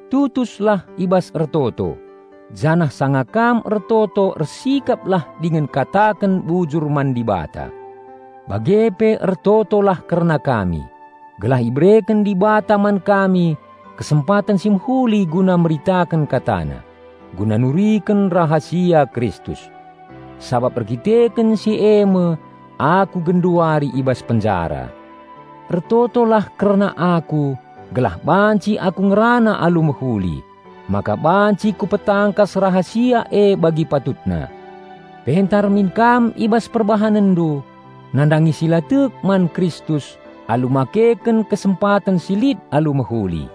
Tutuslah i bas ertoto, janah sanga kam ertoto ersikaplah dingen kataken bujur man Dibata. Bage pe ertotolah kerna kami, gelah ibereken Dibata man kami kesempaten si mehuli guna meritaken KataNa, guna nuriken rahasia Kristus. Sabap erdandanken si e me aku genduari i bas penjara. Ertotolah kerna aku gelah banci aku ngerana alu mehuli, maka banci kupetangkas rahasia e bagi patutna. Pentar min kam i bas perbahanenndu nandangi si la tek man Kristus alu makeken kesempaten si lit alu mehuli.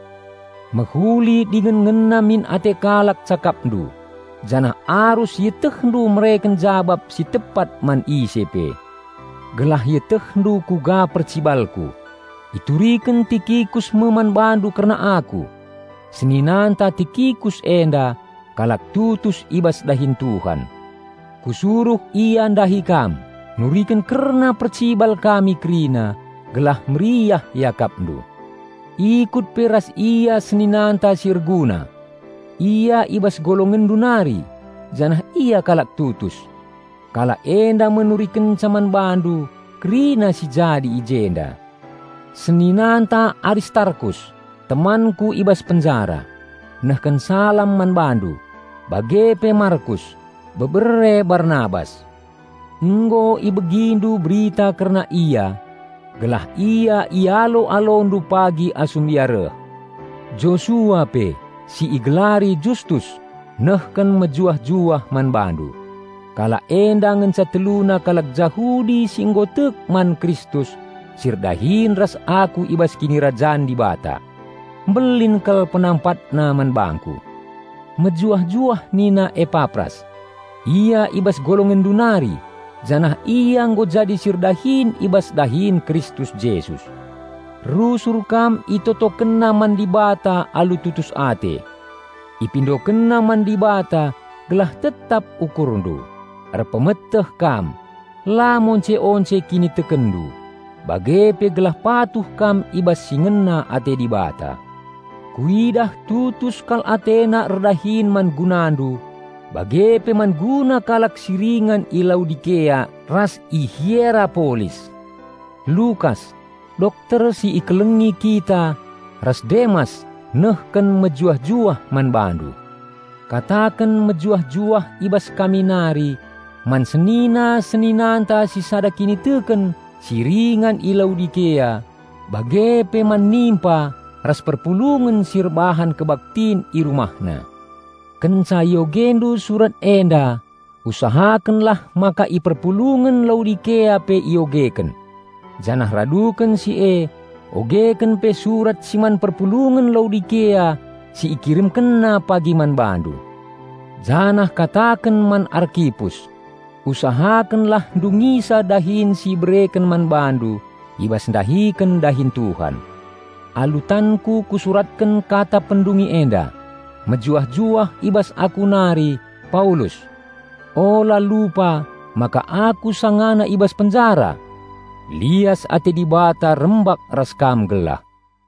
Mehuli dingen ngena min ate kalak cakapndu. Janah arus ietehndu mereken jabap si tepat man ise pe. Gelah ietehndu kuga percibalku, ituriken Tikikus me man bandu kerna aku. Seninanta Tikikus enda, kalak tutus i bas dahin Tuhan. Kusuruh ia ndahi kam nuriken kerna percibal kami kerina, gelah meriah iakapndu. Ikut pe ras ia seninanta si Erguna. Ia i bas golongenndu nari janah ia kalak tutus. Kalak enda me nurikenca man bandu kerina si jadi i jenda. Seninanta Aristarkus, temanku i bas penjara, nehken salam man bandu, bage pe Markus, bebere Barnabas. (Nggo ibegindu berita kerna ia, gelah ia ialo-alondu pagi asum ia reh.) Josua pe, si igelari Justus, nehken mejuah-juah man bandu. Kalak enda ngenca teluna kalak Jahudi si nggo tek man Kristus si erdahin ras aku i bas Kinirajan Dibata. Mbelin kal penampatna man bangku. Mejuah-juah nina Epapras. Ia i bas golongenndu nari janah ia nggo jadi si erdahin i bas dahin Kristus Jesus. Rusur kam itotokenna man Dibata alu tutus ate. Ipindokenna man Dibata gelah tetap ukurndu, erpemeteh kam, la monce-once kinitekenndu, bage pe gelah patuh kam i bas si ngena ate Dibata. Kuidah tutus kal atena erdahin man gunandu bage pe man guna kalak si ringan i Laodikea ras i Hierapolis. Lukas, dokter si ikelengi kita ras Demas nehkenmejuah-juah man bandu. Kataken mejuah-juah i bas kami nari man senina-seninanta si sada kiniteken si ringan i Laodikea, bage pe man Nimpa ras perpulungen si erbahan kebaktin i rumahna. Kenca iogendu surat enda usahakenlah maka i perpulungen Laodikea pe iogeken. Janah raduken si e, ogeken pe surat si man perpulungen Laodikea si ikiremkenna pagi man bandu. Janah kataken man Arkipus, "Usahakenlah ndungisa dahin si ibereken man bandu i bas ndahiken dahin Tuhan." Alu tanku kusuratken kata pendungi enda: Mejuah-juah i bas aku nari, Paulus. Ula lupa maka aku sangana i bas penjara! Lias ate Dibata rembak ras kam gelah.